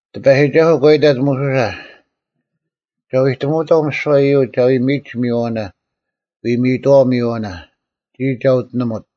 ᑎᐸᔨᒋᒐᓱᐤ ᒂ ᐃᑕᑦ ᒧᓱᓴ, “ᒐ ᐎᑎᒧᐅᑥᐤ ᒥᓯᐛ ᐃᔪᒡ ᒐ ᐎ ᒥᔨᒡ ᒥᔨᐛᐅᓇ, ᐎ ᒥᔨᑥᐛ ᒥᔨᐛᐅᓇ, ᒋᔾ ᒐ ᐅᑎᓂᒧᑦ᙮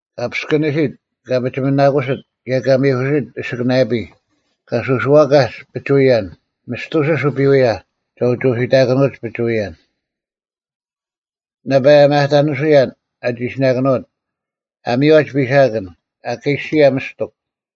ᑲ ᐱᔅᑭᓂᓯᑦ, ᑲ ᐱᒋᒥᓇᑯᓯᑦ ᑭᔭ ᑲ ᒥᐧᑯᓯᑦ ᐊᓯᑭᓂᔭᐱᔾ; ᐊ ᒥᔽᓯᒡ ᐱᒍᐎᔭᓐ; ᒥᔅᑐᓯᔅ ᐅᐱᐎᔭ ᒐ ᐅᒋ ᐅᓯᑕᑭᓄᐅᒡ ᐱᒍᐎᔭᓐ; ᓇᐸ ᒪᔭᑕᓂᓱᔭᓐ ᐊ ᒋᓯᓇᑭᓄᐅᑦ; ᐊ ᒥᔽᒡ ᐱᓴᑭᓐ; ᐊᑲᓯᔭ ᒥᔅᑎᒄ;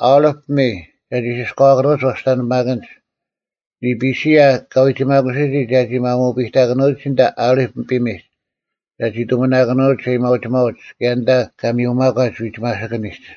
ᐊᓕᑉ ᐱᒥᔾ ᒐᒋ ᓯᔅᑲᐛᑭᓄᐅᒡ ᐛᔅᑕᓂᐱᒪᑭᓐᒡ; ᓂᐱᓯᔭ ᑲ ᐎᒋᒪᑯᓯᔨᒋ ᒐᒋ ᒪᒧᐱᑕᑭᓄᐅᒋ ᐊᓐᑕ ᐊᓕᑉ ᐱᒥᒡ ᒐᒋ ᑐᒥᓇᑭᓄᐅᒡ ᐊᔭᒥᐊᐅᒋᒪᐅᒡ ᑭᔭ ᐊᓐᑕ ᑲ ᒥᔪᒪᒂᒡ ᐎᒋᒪᓯᑭᓂᒡ;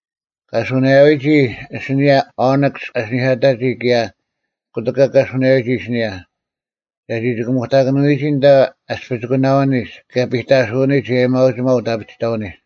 ᑲ ᓱᓇᔭᐎᒋ ᐊᓯᓂᔭ ᐅᓂᒃᔅ ᐊᓯᓂᐧᑲᑕᒋ ᑭᔭ ᑯᑎᒂ ᑲ ᓱᓇᔭᐅᒋ ᐊᓯᓂᔭ, ᒐᒋ ᒋᑭᒧᑕᑭᓂᔨᒋ ᐊᓐᑕ ᐊᔅᐱᒋᑯᓇᐅᓂᒡ ᑭᔭ ᐱᑕᓱᐅᓂᒡ ᐊᔭᒥᐊᐅᒋᒪᐤ ᐅᑦ ᐊᐱᒋᑕᐅᓂᒡ᙮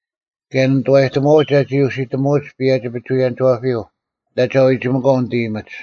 ᑭᔭ ᓂ ᓂᑐᐛᔨᑎᒧᐛᐅᒡ ᒐᒋ ᐅᓯᑎᒧᐅᒡ ᐸᔭᒋ-ᐱᒍᐎᔭᓂᒋᐛᐱᔪᐤ, ᐊᓐᑕ ᒐ ᐎᒋᒥᒂᐤ ᓂᑦ ᐃᔨᒥᒡ᙮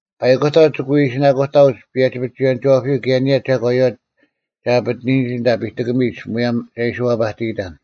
ᐸᐃᑯᑕᐤ ᒋᑭ ᐎ ᐃᓯᓇᑯᑕᐅᒡ ᐸᔭᒋ-ᐱᒍᐎᔭᓂᒋᐛᐱᔪᐤ ᑭᔭ ᐊᓂᔭ ᒐᒂᔪᐛ ᒐ ᐊᐱᑎᓂᔨᒋ ᐊᓐᑕ ᐱᑎᑭᒥᒡ ᒧᔭᒻ ᒐ ᐃᓯ ᐛᐸᑎᔨᑕᓐ᙮”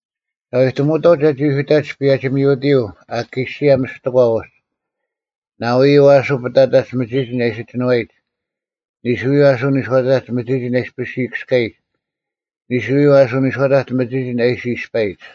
“ᒐ ᐎᑎᒧᐅᑥᐤ ᒐᒋ ᐅᓯᑕᒡ ᐸᔭᒋ-ᒥᐅᑎᔪᐤ ᐊᑲᓯᔭ ᒥᔅᑎᒂ ᐅᒡ ᓇᐎᔪᐤ ᐊᓱ ᐱᑕᑕᒡ ᒥᒋᒋᓐ ᐊ ᐃᓯ ᒋᓏᔨᒡ, ᓂᓱᔪᐤ ᐊᓱ ᓂᔄᐅᑕᒡ ᒥᒋᒋᓐ ᐊ ᐃᔅᐱᔅ ᐃᔨᑭᔅᑲᔨᒡ, ᓂᓱᔪᐤ ᐊᓱ ᓂᔄᐅᑕᒡ ᒥᒋᒋᓐ ᐊ ᐃᓯ ᐃᔅᐸᔨᒡ᙮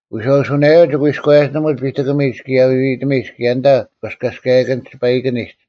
ᐎᔄᐅᓱᓇᔭᐤ ᒋᑭ ᐎᔎᔭᒋᓂᒧᒡ ᐱᑎᑭᒥᒡ ᑭᔭ ᐎᐎᑎᒥᒡ ᑭᔭ ᐊᓐᑕ ᐛᔅᑲᔭᔎᔨᑭᓐᒡ ᒋᐸᐃᑭᓂᒡ᙮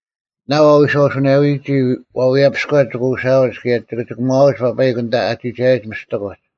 ᓇᐤ ᐊ ᐎᔄᐅᓱᓇᔭᐎᒋ ᐛᐎᔭᐱᔎ ᒋᑭ ᐅᓴᐅᒡ ᑭᔭ ᒋᑭ ᒋᑭᒺᐊᒡ ᐸᐸᐃᒄ ᐊᓐᑕ ᐊ ᒋᒐᔭᒡ ᒥᐅᑎᒡ᙮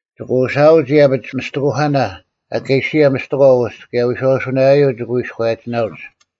ᒋᑭ ᐅᓴᐅᒡ ᐃᔭᐱᒡ ᒥᔅᑎᑯᐧᑲᓇ ᐊᑲᓯᔭ ᒥᔅᑎᒂ ᐅᒡ ᑭᔭ ᐎᔄᐅᓱᓇᔭᔪᐤ ᒋᑭ ᐎᔎᔭᒋᓇᐅᒡ᙮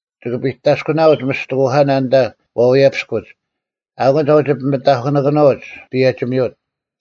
ᒋᑭ ᐱᑕᔅᑯᓄᐅᒡ ᒥᔅᑎᑯᐧᑲᓇ ᐊᓐᑕ ᐛᐎᔭᐱᔅᑯᒡ, ᐊᐅᑯᓐ ᒐ ᐅᒋ ᐱᒥᑕᐧᑯᓂᑭᓄᐅᒡ ᐸᔭᒋ-ᒥᐅᑦ᙮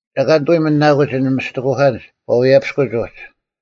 ᒐ ᐊᑲ ᓂᑕ ᐎ ᒥᓇᑯᒡ ᐊᓐᒡ ᒥᔅᑎᑯᐧᑲᓐᒡ ᐛᐎᔭᐱᔅᑯᒡ ᐅᒡ᙮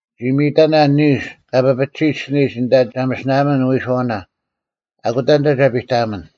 ᒋ ᒥᔨᑕᓇ ᓂᓱ ᑲ ᐱᐱᒋᓯᒡ ᐊᓯᓂᔨᒡ ᐊᓐᑕ ᒐ ᒥᓯᓇᐊᒪᓐ ᓂᐎᓱᐛᐅᓇ, ᐊᑯᑕ ᐊᓐᑕ ᒐ ᐱᑕᐊᒥᓐ᙮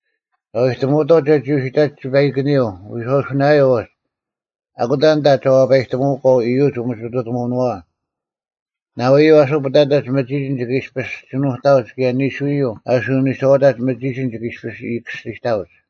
ᒐ ᐎᑎᒧᐅᑥᐤ ᒐᒋ ᐅᓯᑕᒡ ᒋᐸᐃᑭᓂᔪᐤ ᐎᔄᐅᓱᓇᔭᔪᐤ ᐅᒡ᙮ ᐊᑯᑕ ᐊᓐᑕ ᒐ ᐛᐸᔨᑎᒧᐅᒂᐤ ᐃᔪᒡ ᐅᒥᒋᑐᑎᒧᐅᓄᐛᐛ᙮ ᓇᐎᔪᐤ ᐊᓱ ᐱᑕᑕᒡ ᒥᒋᒋᓐ ᒋᑭ ᐃᔅᐱᔅ ᒋᓄᑕᐅᒡ ᑭᔭ ᓂᓱᔪᐤ ᐊᓱ ᓂᔄᐅᑕᒡ ᒥᒋᒋᓐ ᒋᑭ ᐃᔅᐱᔅ ᐃᔨᑭᔅᒋᑕᐅᒡ᙮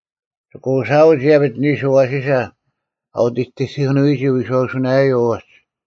ᒋᑭ ᐅᓴᐅᒡ ᐃᔭᐱᒡ ᓂᓱ ᐊᐛᓯᓴ ᐊ ᐅᑎᑎᑭᓄᐎᒋ ᐎᔄᐅᓱᓇᔭᔪᐤ ᐅᒡ᙮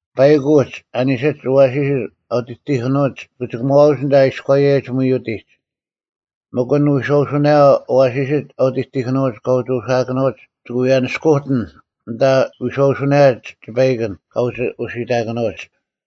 ᐸᐃᒄ ᐅᒡ ᐊ ᓂᓯᒡ ᐊᐛᓯᓯᒡ ᐊ ᐅᑎᑎᑭᓄᐅᒡ ᒋᑭ ᒋᑭᒺᐅᒡ ᐊᓐᑕ ᐊ ᐃᔎᔭᔨᒡ ᒥᐅᑎᒡ, ᒥᒄ ᐊᓐ ᐎᔄᐅᓱᓇᔭᐤ ᐊᐛᓯᓯᒡ ᐊ ᐅᑎᑎᑭᓄᐅᒡ ᑲ ᐅᒋ ᐅᓯᐊᑭᓄᐅᒡ ᒋᑭ ᐎ ᐊᓂᔅᑯᑎᓐ ᐊᓐᑕ ᐎᔄᐅᓱᓇᔭᒡ ᒋᐸᐃᑭᓐ ᑲ ᐅᒋ ᐅᓯᑕᑭᓄᐅᒡ᙮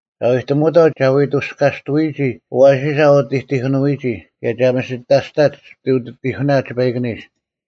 ᒐ ᐎᑎᒧᐅᑥᐤ ᒐ ᐎ ᑕᔅᑲᑐᐎᔨᒋ ᐊᐛᓯᓴ ᐊ ᐅᑎᑎᑭᓄᐎᒋ ᑭᔭ ᒐ ᒥᓯᑕᔅᑕᒡ ᐅᑎᑎᐧᑯᓇ ᒋᐸᐃᑭᓂᒡ᙮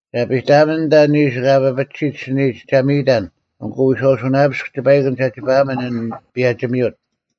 ᒐ ᐱᑕᐊᒥᓐ ᐊᓐᑕ ᓂᓱ ᑲ ᐱᐱᒋᓯᒡ ᐊᓯᓂᔨᒡ ᒐ ᒥᔨᑕᓐ ᐊᑯ ᐎᔄᐅᓱᓇᔭᐱᔅᒃ ᒋᐸᐃᑭᓐ ᒐ ᒋᐸᐊᒥᓐ ᐊᓐ ᐸᔭᒋ-ᒥᐅᑦ᙮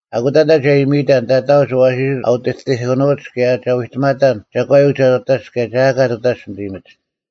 ᐊᑯᑕ ᐊᓐᑕ ᒐ ᐃᒥᔨᑕᓐ ᑕᑕᐅᒡ ᐊᐛᓯᓯᒡ ᐊ ᐅᑎᑎᑭᓄᐅᒡ ᑭᔭ ᒐ ᐎᑎᒪᑕᓐ ᒐᒂᔪᐤ ᒐ ᑐᑕᒡ ᑭᔭ ᒐ ᐊᑲ ᑐᑕᒡ ᓂᑦ ᐃᔨᒥᒡ᙮”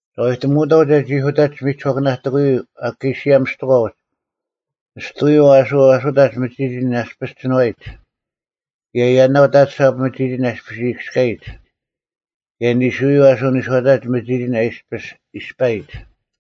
“ᒐ ᐎᑎᒧᐅᑥᐤ ᒐᒋ ᐅᓯᑕᒡ ᒥᒋᓱᐛᑭᓇᑎᑯᔪᐤ ᐊᑲᓯᔭ ᒥᔅᑎᒂ ᐅᒡ, ᓂᔅᑐᐎᔪᐤ ᐊᓱ ᐊᓱᑕᒡ ᒥᒋᒋᓐ ᐊᔅᐱᔅ ᒋᓏᔨᒡ ᑭᔭ ᔭᓇᐤ ᑕᑐᓴᑉ ᒥᒋᒋᓐ ᐊᔅᐱᔅ ᐃᔨᑭᔅᑲᔨᒡ, ᑭᔭ ᓂᓱᐎᔪᐤ ᐊᓱ ᓂᔄᐅᑕᒡ ᒥᒋᒋᓐ ᐊᔅᐱᔅ ᐃᔅᐸᔨᒡ᙮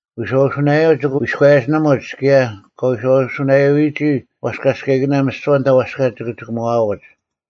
ᐎᔄᐅᓱᓇᔭᔪᐤ ᒋᑭ ᐎᔎᔭᒋᓂᒧᒡ ᑭᔭ ᑲ ᐎᔄᐅᓱᓇᔭᐅᔨᒋ ᐛᔅᑲᔅᑲᐃᑭᓇ ᒥᓯᐛ ᐊᓐᑕ ᐛᔅᑲ ᒋᑭ ᒋᑯᒺᐅᒡ᙮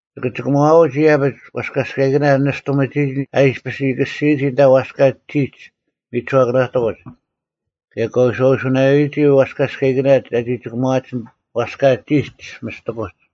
ᒋᑭ ᒋᑭᒺᐅᒡ ᐃᔭᐱᒡ ᐛᔅᑲᔅᑲᐃᑭᓇ ᓂᔅᑐ ᒥᒋᒋᓐ ᐊ ᐃᔅᐱᔅ ᐃᔨᑭᔅᒋᔨᒋ ᐊᓐᑕ ᐛᔅᑲ ᒋᒡ ᒥᒋᓱᐛᑭᓇᑎᑯᒡ, ᑭᔭ ᑲ ᐎᔄᐅᓱᓇᔭᐅᔨᒋ ᐛᔅᑲᔅᑲᐃᑭᓇ ᒐᒋ ᒋᑭᒺᐊᒡ ᐛᔅᑲ ᒋᒡ ᒥᔅᑎᑯᒡ᙮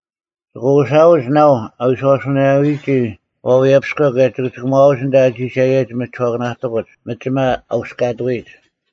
ᒋᑭ ᐅᓴᐅᒡ ᓇᐤ ᐊ ᐎᔄᐅᓱᓇᔭᐅᔨᒋ ᐛᐎᔭᐱᔎ ᑭᔭ ᒋᑭ ᒋᑭᒺᐅᒡ ᐊᓐᑕ ᐊ ᒋᒐᔭᔨᒡ ᒥᒋᓱᐛᑭᓇᑎᑯᒡ ᒥᒋᒪ ᐊ ᐅᔅᑲᑐᐎᔨᒡ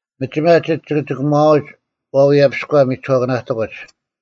ᒥᒋᒪ ᒋᒡ ᒋᑭ ᒋᑭᒺᐅᒡ ᐛᐎᔭᐱᔎ ᒥᒋᓱᐛᑭᓇᑎᑯᒡ᙮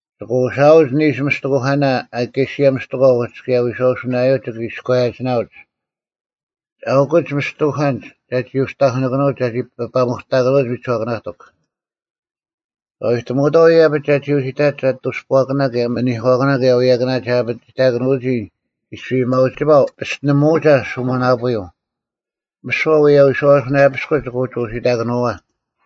ᒋᑭ ᐅᓴᐅᒡ ᓂᓱ ᒥᔅᑎᐧᑯᑲᓇ ᐊᑲᓯᔭ ᒥᔅᑎᒂ ᐅᒡ ᑭᔭ ᐎᔄᐅᓱᓇᔭᔪᐤ ᒋᑭ ᐎᔎᔭᒋᓇᐅᒡ᙮ ᐊᐅᑯᓐᒡ ᒥᔅᑎᐧᑯᑲᓐᒡ ᒐᒋ ᐅᒋ ᑕᐧᑯᓂᑭᓄᐅᒡ ᒐᒋ ᐱᐸᒧᑕᑭᓄᐅᒡ ᒥᒋᓱᐛᑭᓇᑎᒄ᙮ ᒐ ᐎᑎᒧᐅᑥᐤ ᐃᔭᐱᒡ ᒐᒋ ᐅᓯᑕᒡ ᐊᑐᔅᐳᐛᑭᓇ ᑭᔭ ᒥᓂᒂᑭᓇ ᑭᔭ ᐎᔭᑭᓇ ᒐ ᐊᐱᒋᑕᑯᓄᐅᒋ ᐃᔅᐱ ᐊᔭᒥᐊᐅᒋᒪᐤ ᐱᔅᑎᓂᒧᐅᒐ ᓱᒥᓇᐳᔪᐤ᙮ ᒥᓯᐛ ᐅᔭ ᐎᔄᐅᓱᓇᔭᐱᔅᑯᒡ ᒋᑭ ᐅᒋ ᐅᓯᑕᑭᓄᐅᐛ᙮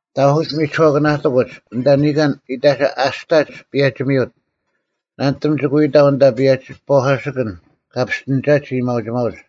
ᑕᐧᑯᒡ ᒥᒋᓱᐛᑭᓇᑎᑯᒡ ᐊᓐᑕ ᓂᑲᓐ ᐃᑕᒐ ᐊᔅᑕᒡ ᐸᔭᒋ-ᒥᐅᑦ, ᓇᓂᑎᒻ ᒋᑭ ᐎ ᑕᐤ ᐊᓐᑕ ᐸᔭᒋ-ᐸᒂᓯᑭᓐ ᑲ ᐱᔅᑎᓂᒐᒡ ᐊᔭᒥᐊᐅᒋᒪᐅᒡ᙮”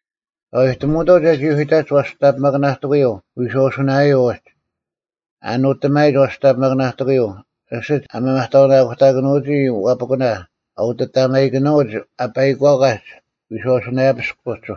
“ᒐ ᐎᑎᒧᐅᑥᐤ ᒐᒋ ᐅᓯᑕᒡ ᐛᔅᑕᓂᐱᒪᑭᓇᑎᑯᔪᐤ ᐎᔄᐅᓱᓇᔭᐤ ᐅᒡ᙮ ᐊ ᓄᑎᒪᔨᒡ ᐛᔅᑕᓂᐱᒪᑭᓇᑎᑯᔪᐤ, ᐊᓯᒡ ᐊᒪᒪᑕᐅᓇᑯᑕᑭᓄᐅᒋ ᐛᐱᑯᓇ ᐊ ᐅᑎᑕᒪᐃᑭᓄᐅᒡ ᐊ ᐸᐃᒂᑲᒡ ᐎᔄᐅᓱᓇᔭᐱᔅᒄ ᐅᒡ᙮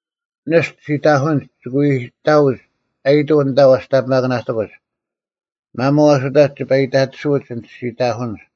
ᓂᔅᑐ ᓯᑕᐧᑯᓐᒡ ᒋᑭ ᐎ ᑕᐅᒡ ᐊᔨᑐᐤ ᐊᓐᑕ ᐛᔅᑕᓂᐱᒪᑭᓇᔅᑯᒡ᙮ ᒪᒧᐤ ᐊᓱᑕᒡ ᒋᐸ ᐃᑕᑎᓱᐅᒡ ᐊᓐᒡ ᓯᑕᐧᑯᓐᒡ᙮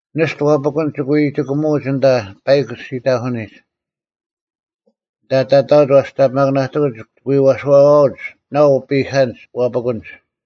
ᓂᔅᑐ ᐛᐱᑯᓐᒡ ᒋᑭ ᐎ ᒋᑭᒧᐅᒡ ᐊᓐᑕ ᐸᐃᒄ ᓯᑕᐧᑯᓂᒡ᙮ ᐊᓐᑕ ᑕᑕᐅᒡ ᐛᔅᑕᓂᐱᒪᑭᓇᑎᑯᒡ ᒋᑭ ᐛᓴᐛᐅᒡ ᓇᐤ ᐱᑲᓐᒡ ᐛᐱᑯᓐᒡ᙮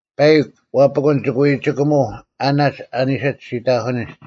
ᐸᐃᒃ ᐛᐱᑯᓐ ᒋᑭ ᐎ ᒋᑭᒧᐤ ᐊᓇᒡ ᐊ ᓂᓯᒡ ᓯᑕᐧᑯᓂᒡ᙮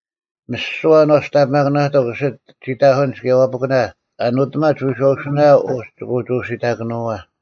ᒥᓯᐛ ᐊᓐ ᐛᔅᑕᓂᐱᒪᑭᓇᑎᒄ ᐊᓯᒡ ᓯᑕᐧᑯᓐᒡ ᑭᔭ ᐛᐱᑯᓇ ᐊ ᓄᑎᒪᒡ ᐎᔄᐅᓱᓇᔭᐤ ᐅᒡ ᒋᑭ ᐅᒋ ᐅᓯᑕᑭᓄᐛ᙮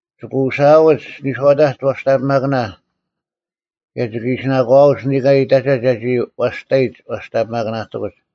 ᒋᑭ ᐅᓯᐊᐅᒡ ᓂᔄᐅᑕᒡ ᐛᔅᑕᓂᐱᒪᑭᓇ ᑭᔭ ᒋᑭ ᐃᓯᓇᒂᐅᒡ ᓂᑲᓐ ᐃᑕᒐ ᒐᒋ ᐛᔅᑕᔨᒡ ᐛᔅᑕᓂᐱᒪᑭᓇᔅᑯᒡ᙮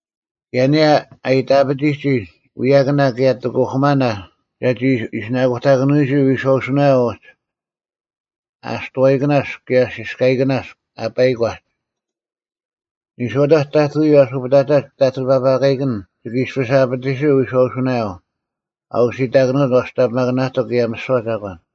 ᑭᔭ ᐊᓂᔭ ᐊ ᐃᑕᐱᑎᒋ ᐎᔭᑭᓇ ᑭᔭ ᑎᑯᐧᑯᒪᓇ ᒐᒋ ᐃᓯᓇᑯᑕᑭᓄᐅᒋ ᐎᔄᐅᓱᓇᔭᐤ ᐅᒡ (ᐊᔅᑐᐛᔨᑭᓇᔅᒄ ᑭᔭ ᓯᔅᑲᐃᑭᓇᔅᒄ ᐊ ᐸᐃᒂᒡ)᙮ ᓂᔄᐅᑕᒡ ᑕᑐᔪᐤ ᐊᓱ ᐱᑕᑕᒡ ᑕᑐᐤ ᑎᐸᐸᑲᐃᑭᓐ ᒋᑭ ᐃᔅᐱᔅ ᐊᐱᑎᓯᐤ ᐎᔄᐅᓱᓇᔭᐤ ᐊ ᐅᓯᑕᑭᓄᐅᒡ ᐛᔅᑕᓂᐱᒪᑭᓇᑎᒄ ᑭᔭ ᒥᓯᐛ ᒐᒂᓐ᙮